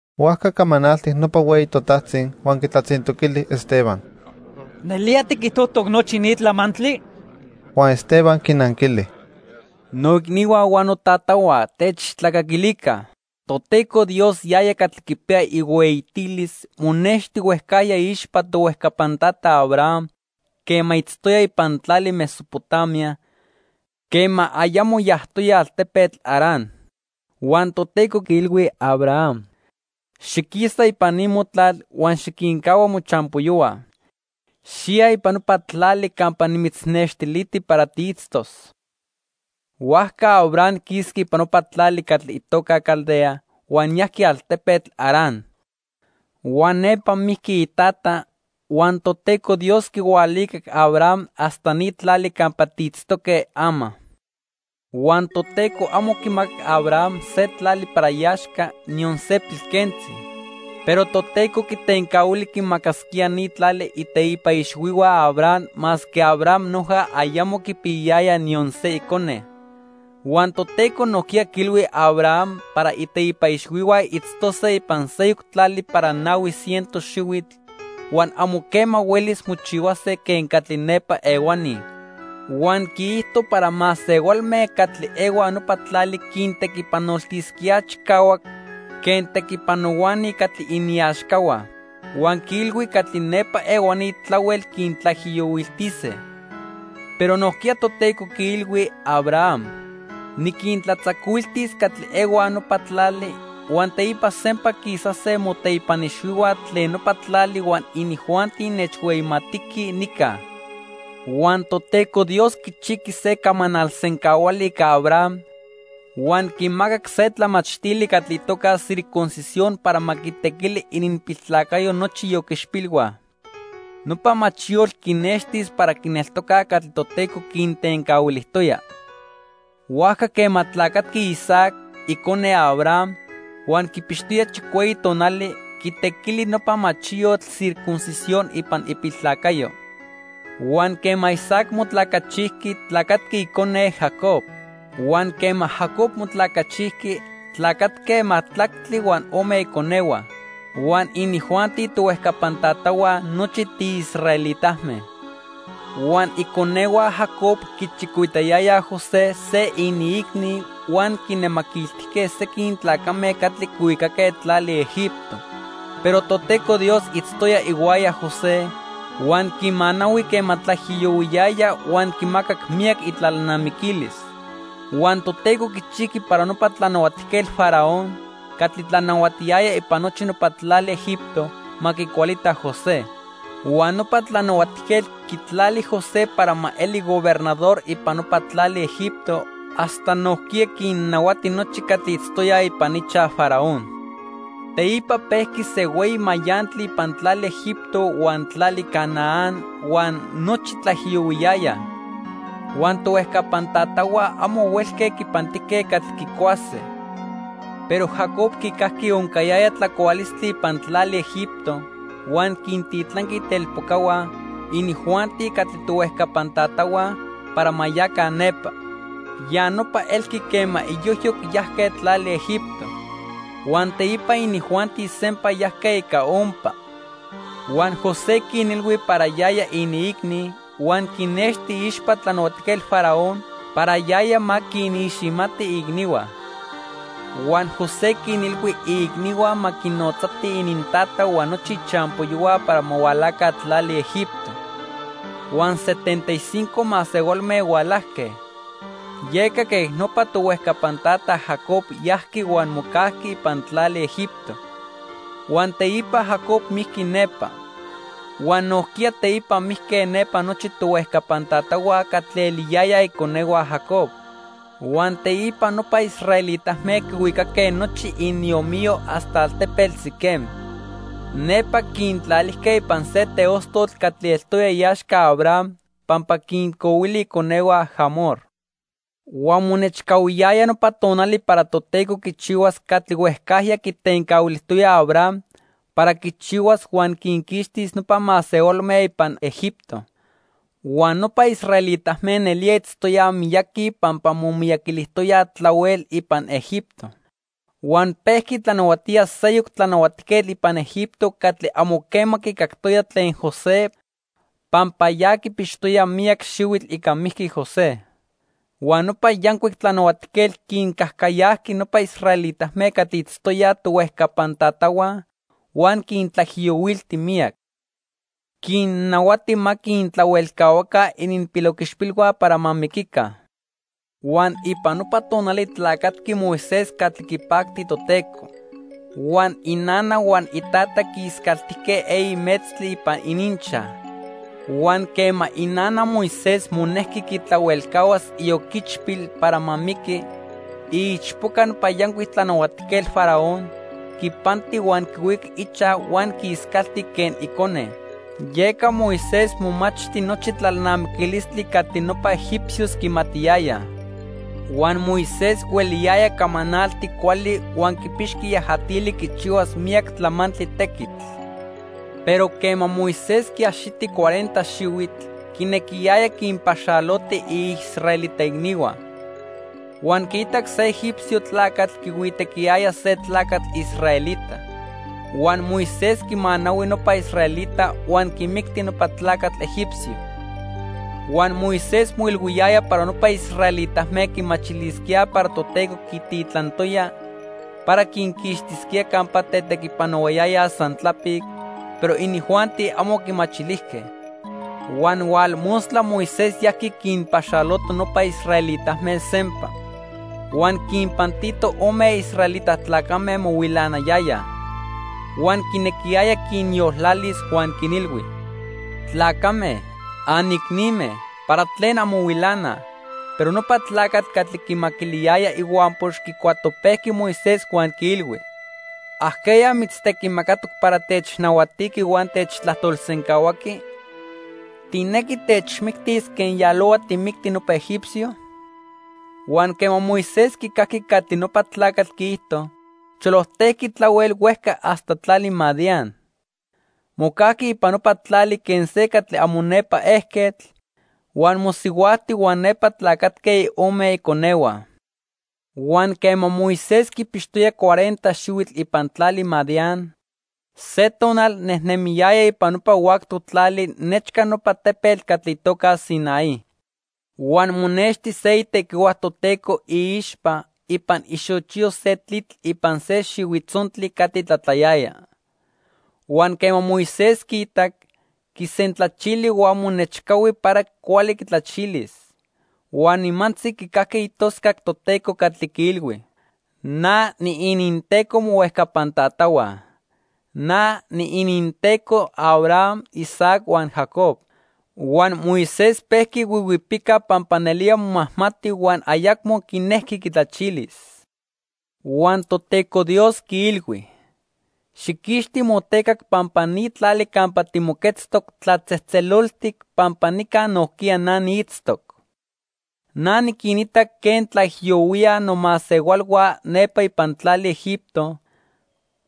Huajca camanaltic nopa hueyi totajtzi huan quitlatzintoquili Esteban: —¿Nelía tiquijtojtoc nochi ni tlamantli? Huan Esteban quinanquili: "Noicnihua huan notatahua, techtlacaquilica. Toteco Dios, yaya catli quipiya ihueyitilis, monexti huejcajya iixpa tohuejcapan tata Abraham quema itztoya ipan tlali Mesopotamia, quema ayamo yajtoya altepetl Harán. Huan Toteco quiilhui Abraham: 'Xiquisa ipan ni motlal huan xiquincahua mochampoyohua. Xiya ipan nopa tlali campa nimitznextiliti para tiitztos.' "Huajca Abraham quisqui ipan nopa tlali catli itoca Caldea, huan yajqui altepetl Harán. Huan nepa mijqui itata, huan Toteco Dios quihualicac Abraham hasta ni tlali campa tiitztoque ama. Huan Toteco amo quimacac Abraham se tlali para iaxca, niyon se pilquentzi. Pero Toteco quitencahuili quinmacasquía ni tlali iteipa ixhuihua Abraham masque Abraham noja ayamo quipiyayaya niyon se icone. Huan Toteco nojquiya quiilhui Abraham para iteipa ixhuihua itztose ipan seyoc tlali para nahui ciento xihuitl huan amo quema huelis mochihuase quen catli nepa ehuani. Huan quiijto para masehualme catli ehuaj nopa tlali quintequipanoltisquíaj chicahuac quen tequipanohuani catli iniaxcahua. Huan quiilhui catli nepa ehuani tlahuel quintlaijiyohuiltise. Pero nojquiya Toteco quiilhui Abraham: 'Niquintlatzacuiltis catli ehuaj nopa tlali, huan teipa sempa quisase moteipan ixhuihua tlen nopa tlali huan inijuanti nechhueyimatiquij nica.' "Huan Toteco Dios quichijqui se camanal sencahuali ica Abraham huan quimacac se tlamachtili catli itoca circuncisión para ma quitequi ininpiltlacayo nochi ioquichpilhua. Nopa machiyotl quinextis para quineltocaj catli Toteco quintencahuilijtoya. Huajca quema tlacatqui Isaac, icone Abraham, huan quipixtoya chicueyi tonali, quitequili nopa machiyotl circuncisión ipan ipiltlacayo. Huan quema Isaac motlacachijqui, tlacatqui icone, Jacob. Huan quema Jacob motlacachijqui, tlacatque majtlactli huan ome iconehua. Huan inijuanti tohuejcapan tatahua nochi tiisraelitame. "Huan iconehua Jacob quichicoitayayaj José, se iniicni, huan quinnemaquiltijque sequin tlacame catli quihuicaque tlali Egipto. Pero Toteco Dios itztoya ihuaya José, huan quimanahui quema tlaijiyohuiyaya huan quimacac miyac itlalnamiquilis. Huan Toteco quichijqui para nopa Tlanahuatijquetl Faraón, catli tlanahuatiyaya ipan nochi nopa tlali Egipto, ma quicualita José. Huan nopa tlanahuatijquetl quitlali José para ma eli gobernador ipan nopa tlali Egipto hasta nojquiya quinnahuati nochi catli itztoyaj ipan ichaj Faraón. "Teipa pejqui se hueyi mayantli ipan tlali Egipto huan tlali Canaán, huan nochi tlaijiyohuiyayaj. Huan tohuejcapan tatahua amo huelque quipantijque catli quicuase. Pero Jacob quicajqui oncayaya tlacualistli ipan tlali Egipto, huan quintitlanqui itelpocahua, inijuanti catli tohuejcapan tatahua, para ma yaca nepa. Ya nopa elqui quema iyojyoc yajque tlali Egipto. Huan teipa inijuanti sempa yajque ica ompa. Huan José quinilhui para yaya iniicni, huan quinnexti iixpa Tlanahuatijquetl Faraón para yaya ma quiniximati iicnihua. Huan José quinilhui iicnihua ma quinotzatij inintata huan nochi ichampoyohua para ma hualaca tlali Egipto. Huan setenta y cinco masehualme hualajque. Yeca quej nopa tohuejcapan tata Jacob yajqui huan mocajqui ipan tlali Egipto. Huan teipa Jacob mijqui nepa. Huan nojquiya teipa mijque nepa nochi tohuejcapan tatahua catli eliyayaj iconehua Jacob. Huan teipa nopa israelitame quihuicaque nochi iniomiyo hasta altepetl Siquem. Nepa quintlalijque ipan se teostotl catli eltoya iaxca Abraham pampa quincohuili iconehua Hamor. "Huan monechcahuiyaya nopa tonali para Toteco quichihuas catli huejcajya quitencahuilijtoya Abraham para quichihuas huan quinquixtis nopa masehualme ipan Egipto. Huan nopa israelitame nelía itztoyaj miyaqui pampa momiyaquilijtoyaj tlahuel ipan Egipto. Huan pejqui tlanahuatía seyoc tlanahuatijquetl ipan Egipto catli amo quema quicactoya tlen José pampa ya quipixtoya miyac xihuitl ica mijqui José. Huan nopa yancuic tlanahuatijquetl quincajcayajqui nopa israelitame catli itztoyaj tohuejcapan tatahua huan quintlaijiyohuilti miyac. Quinnahuati ma quintlahuelcahuaca ininpiloquichpilhua para ma miquica. "Huan ipan nopa tonali tlacatqui Moisés catli quipacti Toteco. Huan inana huan itata quiiscaltijque eyi metztli ipan ininchaj. Huan quema inana Moisés monejqui quitlahuelcahuas ioquichpil para ma miqui, iichpoca nopa yancuic tlanahuatijquetl Faraón quipanti huan quihuicac ichaj huan quiiscalti quen icone. Yeca Moisés momachti nochi tlalnamiquilistli catli nopa egipcios quimatiyayaj. Huan Moisés hueliyaya camanalti cuali huan quipixqui yajatili quichihuas miyac tlamantli tequitl. "Pero quema Moisés quiaxiti cuarenta xihuitl, quinequiyaya quinpaxaloti iisraelita icnihua. Huan quiitac se egipcio tlacatl quihuitequiyaya se tlacatl israelita. Huan Moisés quimanahui nopa israelita huan quimicti nopa tlacatl egipcio. Huan Moisés moilhuiyaya para nopa israelitame quimachilisquíaj para Toteco quititlantoya para quinquixtisquía campa tetequipanohuayayaj san tlapic, pero inijuanti amo quimachilijque. Huan hualmostla Moisés yajqui quinpaxaloto nopa israelitame sempa. Huan quinpantito ome israelita tlacame mohuilanayayaj. Huan quinequiyaya quinyoltlalis huan quinilhui: 'Tlacame, anicnime, ¿para tlen anmohuilanaj?' "Pero nopa tlacatl catli quimaquiliyaya ihuampox quicuatopejqui Moisés huan quiilhui: '¿Ajqueya mitztequimacatoc para technahuatiqui huan techtlajtolsencahuaqui? ¿Tijnequi techmictis quen yalohua tijmicti nopa egipcio?' Huan quema Moisés quicajqui catli nopa tlacatl quiijto, cholojtejqui tlahuel huejca hasta tlali Madián. Mocajqui ipan nopa tlali quen se catli amo nepa ejquetl, huan mosihuajti huan nepa tlacatque ome iconehua. "Huan quema Moisés quipixtoya cuarenta xihuitl ipan tlali Madián, se tonal nejnemiyaya ipan nopa huactoc tlali nechca nopa tepetl catli itoca Sinaí. Huan monexti se itequihua Toteco iixpa ipan ixochiyo se tlitl ipan se xihuitzontli catli tlatlayaya. Huan quema Moisés quiitac, quisentlachili huan monechcahui para cuali quitlachilis. Huan nimantzi quicajqui itoscac Toteco catli quiilhui: 'Na niininTeco mohuejcapan tatahua. Na niininTeco Abraham, Isaac huan Jacob.' Huan Moisés pejqui huihuipica pampa nelía momajmati huan ayacmo quinejqui quitlachilis. Huan Toteco Dios quiilhui: 'Xijquixti motecac pampa ni tlali campa timoquetztoc tlatzejtzeloltic, pampa nica nojquiya na niitztoc. Na niquinita quen tlaijiyohuíaj nomasehualhua nepa ipan tlali Egipto,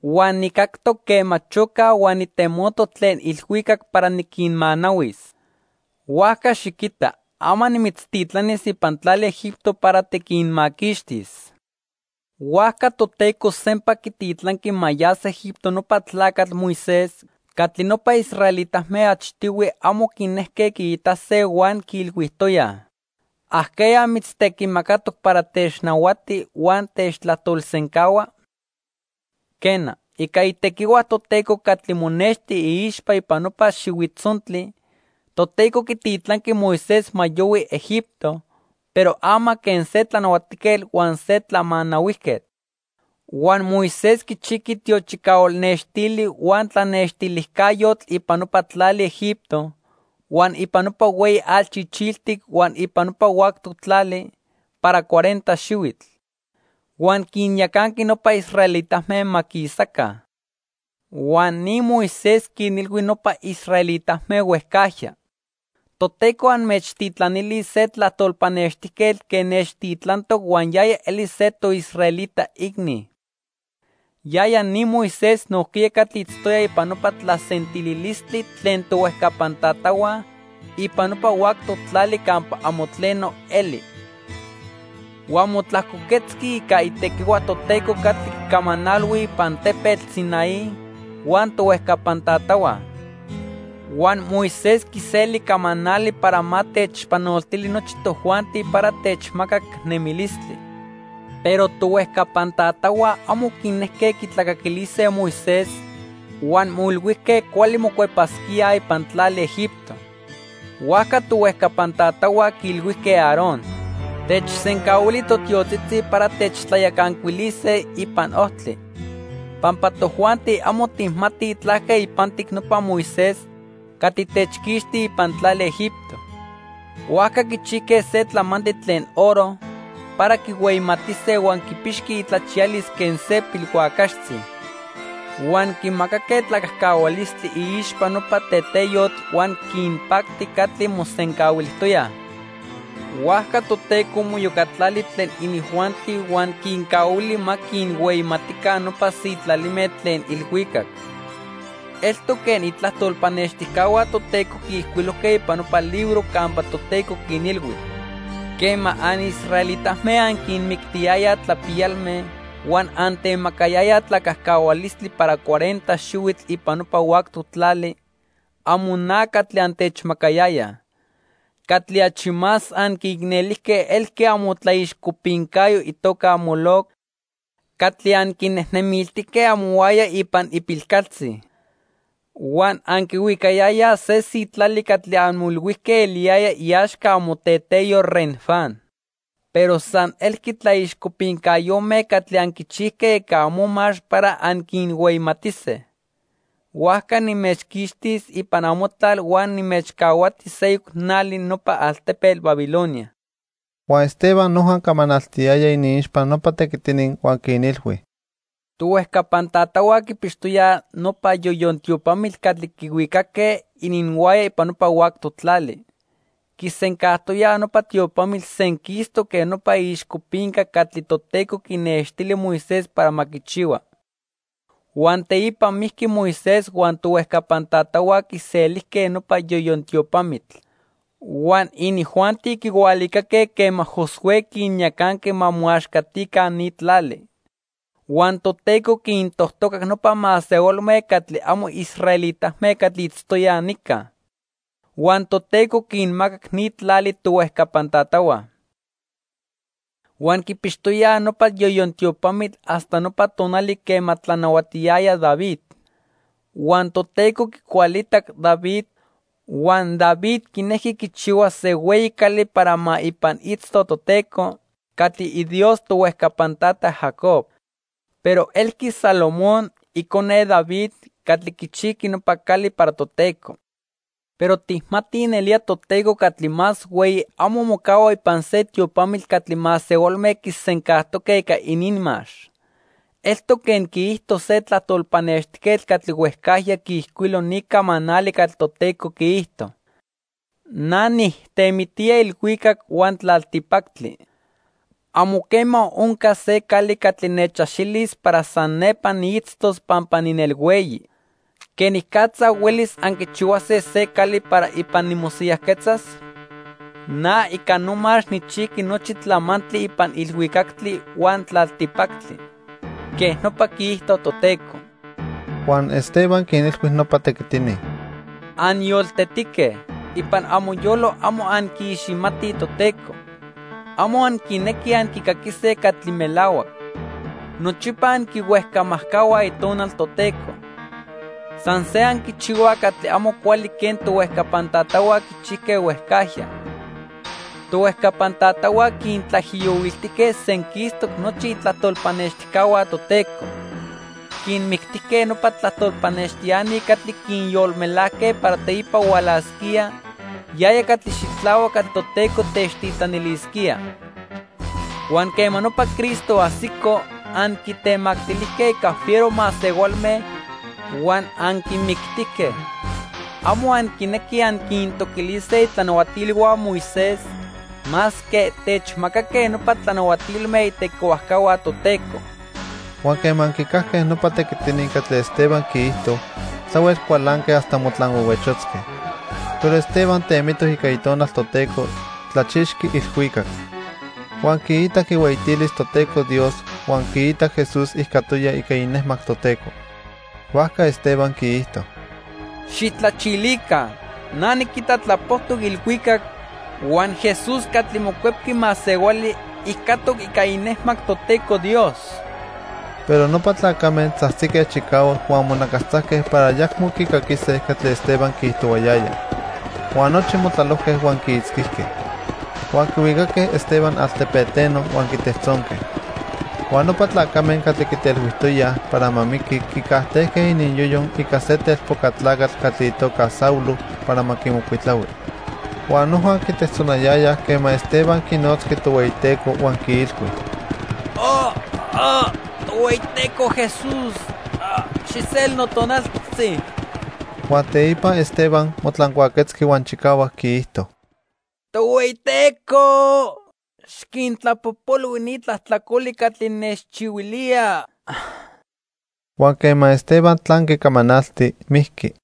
huan nijcactoc quema chocaj huan nitemotoc tlen ilhuicac para niquinmanahuis. Huajca xiquita, ama nimitztitlanis ipan tlali Egipto para tiquinmaquixtis.' "Huajca Toteco sempa quititlanqui ma yas Egipto nopa tlacatl Moisés catli nopa israelitame achtihui amo quinejque quiitase huan quiilhuijtoyaj: '¿Ajqueya mitztequimacatoc para technahuati huan techtlajtolsencahua?' Quena, ica itequihua Toteco catli monexti iixpa ipan nopa xihuitzontli, Toteco quititlanqui Moisés ma yohui Egipto, pero ama quen se tlanahuatijquetl huan se tlamanahuijquetl. Huan Moisés quichijqui tiochicahual nextili huan tlanextilijcayotl ipan nopa tlali Egipto, huan ipan nopa Hueyi Atl Chichiltic huan ipan nopa huactoc tlali para cuarenta xihuitl. Huan quinyacanqui nopa israelitame ma quisaca. Huan ni Moisés quinilhui nopa israelitame huejcajya: 'Toteco anmechtitlanilis se tlajtol pannextijquetl quen nechtitlantoc huan yaya elis se toisraelita icni.' Yaya ni Moisés nojquiya catli itztoya ipan nopa tlasentililistli tlen tohuejcapan tatahua ipan nopa huactoc tlali campa amo tleno eli. Huan motlajcoquetzqui ica itequihua Toteco catli quicamanalhui ipan tepetl Sinaí huan tohuejcapan tatahua. Huan Moisés quiseli camanali para ma techpanoltili nochi tojuanti para techmacac nemilistli. "Pero tohuejcapan tatahua amo quinejque quitlacaquilise Moisés huan moilhuijque cuali mocuepasquíaj ipan tlali Egipto. Huajca tohuejcapan tatahua quiilhuijque Aarón: 'Techsencahuili totiotzitzi para techtlayacancuilise ipan ojtli, pampa tojuanti amo tijmatij tlaque ipantic nopa Moisés catli techquixti ipan tlali Egipto.' Huajca quichijque se tlamantli tlen oro para quihueyimatise huan quipixqui itlachiyalis quen se pilhuacaxtzi. Huan quimacaque tlacajcahualistli iixpa nopa teteyotl huan quinpacti catli mosencahuilijtoyaj. Huajca Toteco moiyocatlali tlen inijuanti huan quincahuili ma quinhueyimatica nopa sitlalime tlen ilhuicac. Eltoc quen itlajtol pannextijcahua Toteco quiijcuilojque ipan nopa libro campa Toteco quinilhui: 'Quema anisraelitame anquinmictiyayaj tlapiyalme, huan antemacayayaj tlacajcahualistli para cuarenta xihuitl ipan nopa huactoc tlali, amo na catli antechmacayayaj. Catli achi más anquiicnelijque elqui amotlaixcopincayo itoca Moloc catli anquinejnemiltijque amohuaya ipan ipilcaltzi. Huan anquihuicayayaj se sitlali catli anmoilhuijque eliyaya iaxca amoteteyo Renfán. Pero san elqui tlaixcopincayome catli anquichijque ica amomax para anquinhueyimatise. Huajca nimechquixtis ipan amotlal huan nimechcahuati seyoc nali nopa altepetl Babilonia.' " Huan Esteban noja camanaltiyaya iniixpa nopa tequitini huan quinilhui: "Tohuejcapan tatahua quipixtoyaj nopa Yoyon Tiopamitl catli quihuicaque ininhuaya ipan nopa huactoc tlali. Quisencajtoyaj nopa tiopamitl senquistoc quen nopa iixcopinca catli Toteco quinextili Moisés para ma quichihua. Huan teipa mijqui Moisés huan tohuejcapan tatahua quiselijque nopa Yoyon Tiopamitl. Huan inijuanti quihualicaque quema Josué quinyacanqui ma moaxcatica ni tlali. Huan Toteco quintojtocac nopa masehualme catli amo israelitame catli itztoyaj nica. Huan Toteco quinmacac ni tlali tohuejcapan tatahua. Huan quipixtoyaj nopa Yoyon Tiopamitl hasta nopa tonali quema tlanahuatiyaya David. Huan Toteco quicualitac David, huan David quinejqui quichihuas se hueyi cali para ma ipan itzto Toteco, catli iDios tohuejcapan tata Jacob. Pero elqui Salomón, icone David, catli quichijqui nopa cali para Toteco. Pero tijmatij nelía Toteco Catli Más Hueyi amo mocahua ipan se tiopamitl catli masehualme quisencajtoque ica ininmax. Eltoc quen quiijto se tlajtol pannextijquetl catli huejcajya quiijcuilo ni camanali catli Toteco quiijto: 'Na nijtemitía ilhuicac huan tlaltipactli. Amo quema oncas se cali catli nechaxilis para san nepa niitztos pampa ninelhueyi. ¿Quenicatza huelis anquichihuase se cali para ipan nimosiyajquetzas? Na ica nomax nijchijqui nochi tlamantli ipan ilhuicactli huan tlaltipactli.' Quej nopa quiijto Toteco." Huan Esteban quinilhui nopa tequitini: "¡Anyoltetique! Ipan amoyolo amo anquiiximatij Toteco. Amo anquinequij anquicaquise catli melahuac. Nochipa anquihuejcamajcahuaj Itonal Toteco. San se anquichihuaj catli amo cuali quen tohuejcapan tatahua quichijque huejcajya. Tohuejcapan tatahua quintlaijiyohuiltijque senquistoc nochi itlajtol pannextijcahua Toteco. Quinmictijque nopa tlajtol pannextiani catli quinyolmelajque para teipa hualasquía Yaya Catli Xitlahuac catli Toteco techtitlanilisquía. Huan quema nopa Cristo ajsico, anquitemactilijque ica fiero masehualme huan anquimictijque. Amo anquinequij anquintoquilise itlanahuatilhua Moisés masque techmacaque nopa tlanahuatilme itequihuajcahua Toteco." Huan quema quicajque nopa tequitini catli Esteban quiijto, tlahuel cualanque hasta motlanhuehuechotzque. Pero Esteban temitoc ica Itonal Toteco, tlachixqui ilhuicac. Huan quiitac ihueyitilis Toteco Dios huan quiitac Jesús ijcatoya ica inejmac Toteco. Huajca Esteban quiijto: —¡Xijtlachilica! Na niquita tlapojtoc ilhuicac, huan Jesús catli Mocuepqui Masehuali ijcatoc ica inejmac Toteco Dios. Pero nopa tlacame tzajtzique chicahuac huan monacastzajque para ayacmo quicaquise catli Esteban quiijtohuayaya. Huan nochi motlalojque huan quiitzquijque. Huan quihuicaque Esteban altepeteno huan quitejtzonque. Huan nopa tlacame catli quitelhuijtoyaj para ma miqui quicajtejque ininyoyo ica se telpoca tlacatl catli itoca Saulo para ma quimocuitlahui. Huan noja quitejtzonayayaj quema Esteban quinotzqui Tohueyiteco huan quiilhui: "Tohueyiteco Jesús, xijseli notonaltzi." Huan teipa Esteban motlancuaquetzqui huan chicahuac quiijto: "Tohueyiteco, xiquintlapojpolhui ni tlajtlacoli catli nechchihuilíaj." Huan quema Esteban tlanqui camanalti, mijqui.